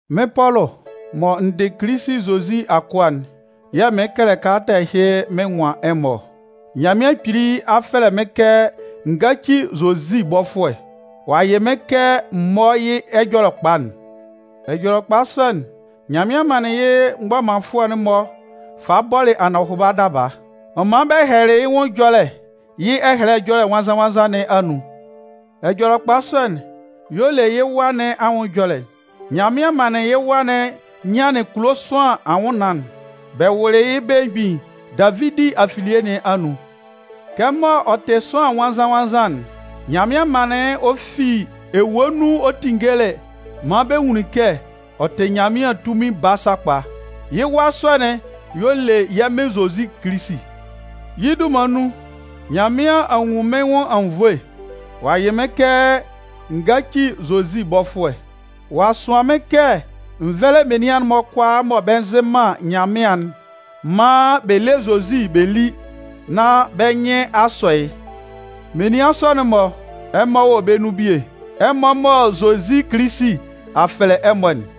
Mɩ́n Pɔlʋ mɔ n dɩ Kilisi Zozi akʋa'n yɛ̂ mɩɩn kɛlɛ kalata ɛhɩ mɩn nwan ɛmɔ ɔ. Nyanmɩan Kpili a fɛlɛ mɩ́n kɛ n gáci Zozi bɔfʋɛ, ɔ'a yɩ mɩ́n kɛ m mɔ́ yɩ́ Ɛjɔlɛkpa'n. Ɛjɔlɛkpa sɔ'n, Nyanmɩan manlɩn yɩ́ mgbɔmanfʋɛ'n-mɔ falɩ bɔlɩ anɔhʋba daba. Ɔ manlɩn bɛ hɛlɛlɩ yɩ́ nwʋn ɛjɔlɛ yɩ́ Ɛhɛlɛ Ɛjɔlɛ Nwannzan-nwannzan nɩn anun. Ɛjɔlɛkpa sɔ'n, y'ɔ le yɩ́ Wa nɩn anwʋn ɛjɔlɛ'n. Nyanmɩan manlɩn yɩ́ Wa'n nyanlɩn kulo sʋanlan anwʋnnaan, bɛ wʋlɩ yɩ́ belemgbin Davidi afilie nɩn anun. Kɛmɔ ɔ tɩ sʋanlan nwannzan-nwannzan'n, Nyanmɩan manlɩn ɔ fi ewue nun ɔ tinngelɩ maan bɛ nwunlin kɛ ɔ tɩ Nyanmɩan tunmin Baa sakpa. Yɩ́ Wa sɔ'n y'ɔ le yɛ́ Mɩn Zozi Kilisi. Yɩ́ dunman nun, Nyanmɩan a nwun mɩ́n nwʋn anwunnvoe, ɔ'a yɩ mɩ́n kɛ n gáci Zozi bɔfʋɛ. Ɔ'a sʋan mɩ́n kɛ n vɛ́lɛ menian'n-mɔ kʋalaa mɔ bɛ nzɩ man Nyanmɩan'n maan bɛ lé Zozi bɛ lí nán bɛ́ nyɩn a sɔ yɩ́. Menian sɔ'n-mɔ, ɛmɔ wɔ bɛ́ nun bie, ɛmɔ mɔ Zozi Kilisi a fɛlɛ ɛmɔ'n.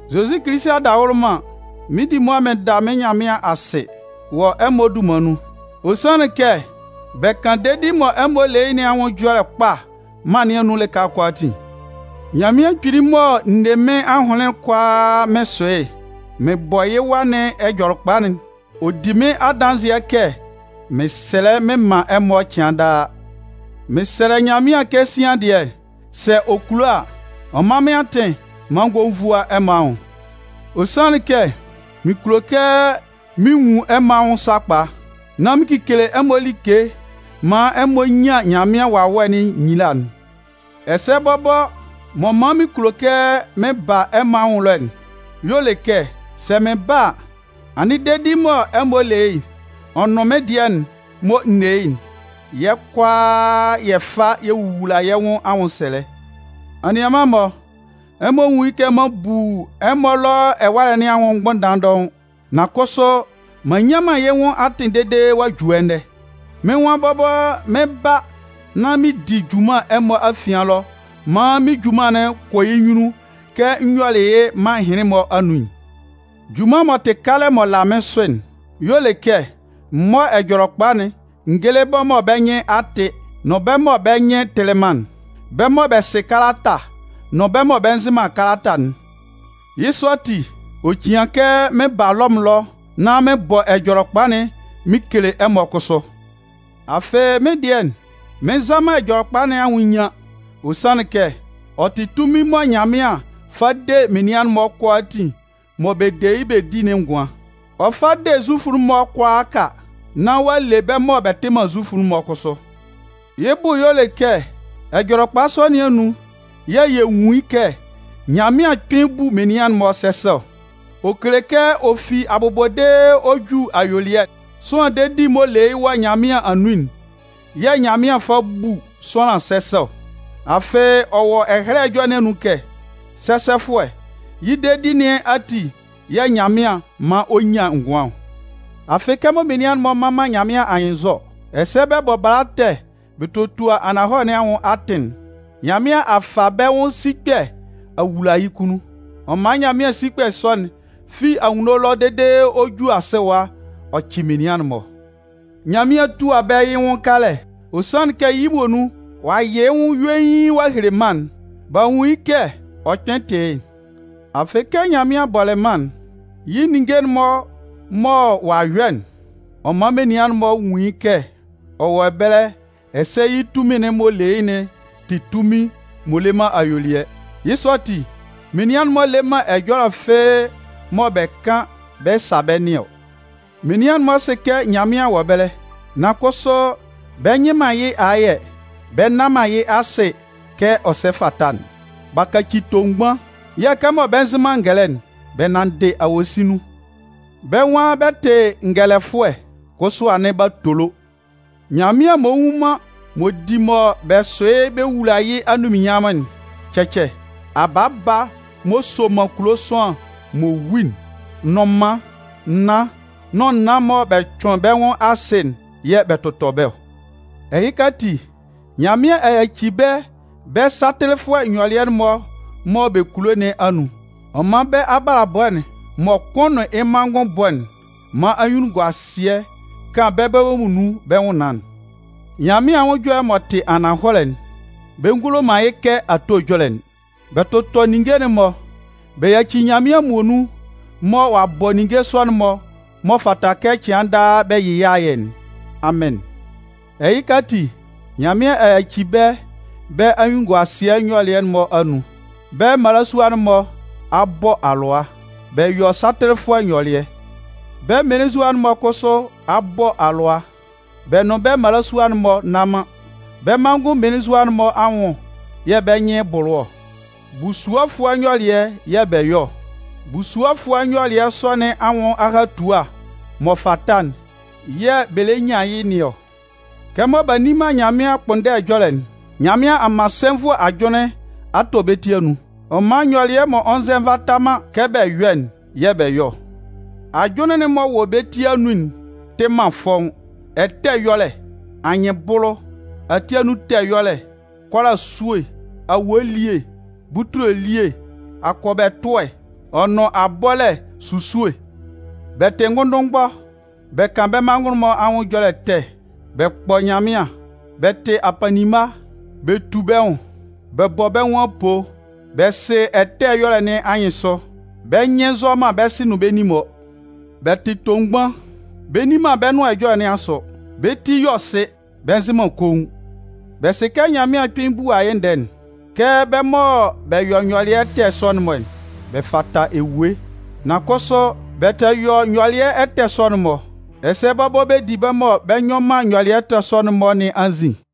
Zozi Kilisi adawʋlʋman, mɩn 'di mʋa mɩn da mɩ́n Nyanmɩan asɩ wɔ ɛmɔ dunman nun. Ɔ sanlɩn kɛ bɛ kan dedi'n mɔ ɛmɔ le yɩ́ nɩn anwʋn ɛjɔlɛ kpa mân nɩn anun lɩka kʋalaatin. Nyanmɩan Kpili mɔ n ne mɩ́n ahʋnlɩn kʋalaa mɩn sʋ yɩ́, mɩn bɔ yɩ́ Wa nɩn Ɛjɔlɛkpa'n, ɔ di mɩ́n adanzɩɛ kɛ mɩn sɛlɛ mɩn man ɛmɔ cɩan daa. Mɩn sɛlɛ Nyanmɩan kɛ sian dɩɛ, sɛ ɔ kulo a, ɔ mán mɩ́n atɩn maan n gɔ́ n vúa ɛmɔ anwʋn. Ɔ sanlɩn kɛ mɩn kulo kɛ mɩn nwun ɛmɔ anwʋn sakpa, nán mɩn kekele ɛmɔ like maan ɛmɔ nyan Nyanmɩan Wawɛ'n nyila'n. Ɛsɛ bɔbɔ m'ɔ man mɩn kulo kɛ mɩn ba ɛmɔ anwʋn ɛlɔ'n y'ɔ le kɛ sɛ mɩn ba a, anɩn dedi'n mɔ ɛmɔ le yɩ́'n, ɔ nʋn mɩ́n dɩɛ'n mɔ n ne yɩ́'n, yɛ́ kʋalaa yɛ fa yɛ wowula yɛ́ nwʋn anwʋnsɛlɛ. Anianman-mɔ, ɛmɔ nwún yɩ́ kɛ m'an bu ɛmɔ ɛlɔ ɛwalɛ nɩn anwʋn mgbʋnndan dɔʋn. Nan kʋsʋ m'an nnyan man yɩ́ nwʋn atɩn dede ɔ'a ju ɛnɛ. Mɩ́n nwan bɔbɔ mɩn 'ba nán mɩn di junman ɛmɔ afian ɛlɔ maan mɩ́n junman'n kɔ yɩ́ nyunnun kɛ n yɔlɩ yɩ́ mân ɛhɩnlɩn-mɔ anun'n. Junman m'ɔ tɩ kalɛ m'ɔ la mɩ́n sʋ'n y'ɔ le kɛ m mɔ́ Ɛjɔlɛkpa'n n géle bɛ́ mɔ bɛ́ nyɩn a tɩ nʋn bɛ́ mɔ bɛ́ nyɩn tɩlɩ man'n, bɛ mɔ́ bɛ sɩ kalata nʋn bɛ́ mɔ bɛ nzɩ man kalata'n. Yɩ́ sɔ ati, ɔ cian kɛ mɩn ba Lɔmʋn ɛlɔ nán mɩn bɔ Ɛjɔlɛkpa'n mɩn kele ɛmɔ kʋsʋ. Afɩ, mɩ́n dɩɛ, mɩn nza man Ɛjɔlɛkpa nɩn anwʋn nyian. Ɔ sanlɩn kɛ ɔ tɩ tunmin mɔ Nyanmɩan fa de menian'n-mɔ kʋalaatin mɔ bɛ de yɩ́ bɛ di'n ngʋan. Ɔ fa de Zufʋ'n-mɔ kʋalaaka, nán ɔ'a le bɛ́ mɔ bɛ tɩ man Zufʋ'n kʋsʋ. Yɩ́ bʋ y'ɔ le kɛ Ɛjɔlɛkpa sɔ nɩn anun yɛ̂ yɛ nwun kɛ Nyanmɩan kpɩn bu menian'n-mɔ sɛsɛ ɔ. Ɔ kele kɛ ɔ fi abʋbɔ dede ɔ ju ayuelɩɛ, sʋanlan dedi m'ɔ le yɩ́ wɔ Nyanmɩan anun'n yɛ̂ Nyanmɩan fa bu sʋanlan sɛsɛ ɔ. Afɩ ɔ wɔ Ɛhɛlɛ Ɛjɔlɛ nɩn anun kɛ: Sɛsɛfʋɛ, yɩ́ dedi nɩn ati yɛ̂ Nyanmɩan 'man ɔ nyan ngʋan ɔ. Afɩ kɛmɔ menian'n-mɔ mman man Nyanmɩan anyɩnnzɔ, ɛsɛ bɛ bɔ bala ɛtɛ bɛ totua ananhɔlɛ nɩn anwʋn atɩn'n, Nyanmɩan a fa bɛ́ nwʋn sikpɛ a wula yɩ́ kunnun. Ɔ man Nyanmɩan sikpɛ sɔ'n fi anwunno ɛlɔ dede ɔ ju asɩ ɛwa ɔ cɩ menian'n-mɔ. Nyanmɩan 'tua bɛ́ yɩ́ nwʋn kalɛ, ɔ sanlɩn kɛ yɩ́ muonun, ɔ'a yɩ yɩ́ nwʋn yuein a hele mân'n, b'a nwun yɩ́ kɛ ɔ kpɩn tɩ yɩ́'n. Afɩ kɛ Nyanmɩan bɔlɩ mân'n, yɩ́ ninnge'n-mɔ mɔ ɔ'a yɔ'n, ɔ man menian'n-mɔ nwun yɩ́ kɛ ɔ wɔ ɛbɛlɛ ɛsɛ yɩ́ tunmin'n m'ɔ le yɩ́'n tɩ tunmin m'ɔ le man ayuelɩɛ. Yɩ́ sɔ ati, menian'n-mɔ le man ɛjɔlɛ fɩ́ɩ́ mɔ bɛ kan bɛ sa bɛ́ nɩn ɔ. Menian'n-mɔ sɩ kɛ Nyanmɩan wɔ ɛbɛlɛ, nan kʋsʋ bɛ nyɩ man yɩ́ ayɛ bɛ nna man yɩ́ asɩ kɛ ɔ sɛ fata'n. B'a kaci tomgban. Yɛ̂ kɛmɔ bɛ nzɩ man ngɛlɛ'n, bɛ nanndɩ awosin nun. Bɛ nwan bɛ tɩ ngɛlɛfʋɛ, kʋsʋ anɩn b'a tolo. Nyanmɩan m'ɔ nwu man m'ɔ di mɔ bɛ sʋ yɩ́ bɛ wula yɩ́ anunminnyanmʋn'n, cɛcɛ, abaaba m'ɔ soman kulo sʋanlan m'ɔ wu'n, nnʋnman, naan nʋn naan mɔ bɛ cʋɩn bɛ́ nwʋn asɩ'n yɛ̂ bɛ tʋtɔ bɛ́ ɔ. Ɛhɩka ati, Nyanmɩan a yaci bɛ́ bɛ́ satɩlɩfʋɛ nyɔlɩɛ'n-mɔ mɔ bɛ kulo nɩn anun. Ɔ man bɛ́ abalabɔ'n mɔ kʋn nʋn yɩ́ manngʋn bɔ'n man anyunnunguasɩɛ kan bɛ́ bɔbɔ muonun bɛ́ nwʋnnaan'n. Nyanmɩan anwʋn ɛjɔlɛ'n m'ɔ tɩ ananhɔlɛ'n, bɛ ngulo man kɛ ato ɛjɔlɛ'n. Bɛ tʋtɔ ninnge'n-mɔ bɛ yaci Nyanmɩan muonun mɔ ɔ'a bɔ ninnge sɔ'n-mɔ'n m'ɔ fata kɛ cɩan daa bɛ yɩ yɩ́ ayɛ'n. Amɩn! Ɛhɩka ati, Nyanmɩan a yaci bɛ́ bɛ́ anyunnunguasɩɛ nyɔlɩɛ'n-mɔ anun. Bɛ́ mmalasua'n-mɔ a bɔ alʋa. Bɛ yɔ satɩlɩfʋɛ nyɔlɩɛ. Bɛ́ mmelenzua'n-mɔ kʋsʋ a bɔ alʋa. Bɛ nʋn bɛ́ mmalasua'n-mɔ nna man. Bɛ́ manngʋn mmelenzua'n-mɔ anwʋn yɛ̂ bɛ́ nyɩn bʋlʋ ɔ. Busuɔfʋɛ nyɔlɩɛ yɛ̂ bɛ yɔ ɔ. Busuɔfʋɛ nyɔlɩɛ sɔ nɩn anwʋn ahatua m'ɔ fata'n yɛ̂ bɛ lɛ nyan yɩ nɩn ɔ. Kɛmɔ b'a nni man Nyanmɩan ɛkpʋnndɛ ɛjɔlɛ'n, Nyanmɩan a man sɛnvʋɛ ajʋnlɩn a tɔ bɛ́ ti anun. Ɔ man nyɔlɩɛ m'ɔ nzɛ nvata man kɛ bɛ yɔ'n yɛ̂ bɛ yɔ ɔ. Ajʋnlɩn'n m'ɔ wɔ bɛ́ ti anun'n tɩ man fɔ́ʋ́n: ɛtɛ ɛyɔlɛ, anyɩnbʋlʋ, ati anun ɛtɛ ɛyɔlɛ, kʋ́ála esúe, awue elie, butule elie, akɔbɛ ɛtʋɛ, ɔ nʋn abɔlɛ esusue. Bɛ tɩ ngʋndʋnmgbɔ, bɛ kan bɛ́ manngʋn-mɔ anwʋn ɛjɔlɛ ɛtɛ. Bɛ kpɔ Nyanmɩan, bɛ tɩ apanninma, bɛ tu bɛ́ nwʋn, bɛ bɔ bɛ́ nwʋn apoo. Bɛ sɩ ɛtɛ ɛyɔlɛ nɩn anyɩnsʋ, bɛ́ nyɩn nzɔ man bɛ́ sɩ nʋn bɛ́ nin-mɔ. Bɛ tɩ tomgban, bɛ nni man bɛ́ nʋan ɛjɔlɛ nɩn sʋ, bɛ́ ti yɔ sɩ, bɛ nzɩ man koun. Bɛ sɩ kɛ Nyanmɩan kpɩn bua yɩ́ ndɛɛ'n, kɛ bɛ́ mɔ bɛ yɔ nyɔlɩɛ ɛtɛ sɔ'n-mɔ, bɛ fata ewue. Nan kʋsʋ, bɛ tɛ yɔ nyɔlɩɛ ɛtɛ sɔ'n-mɔ, ɛsɛ bɔbɔ bɛ di bɛ́ mɔ bɛ yɔ nyɔlɩɛ ɛtɛ sɔ'n-mɔ nɩn anzin.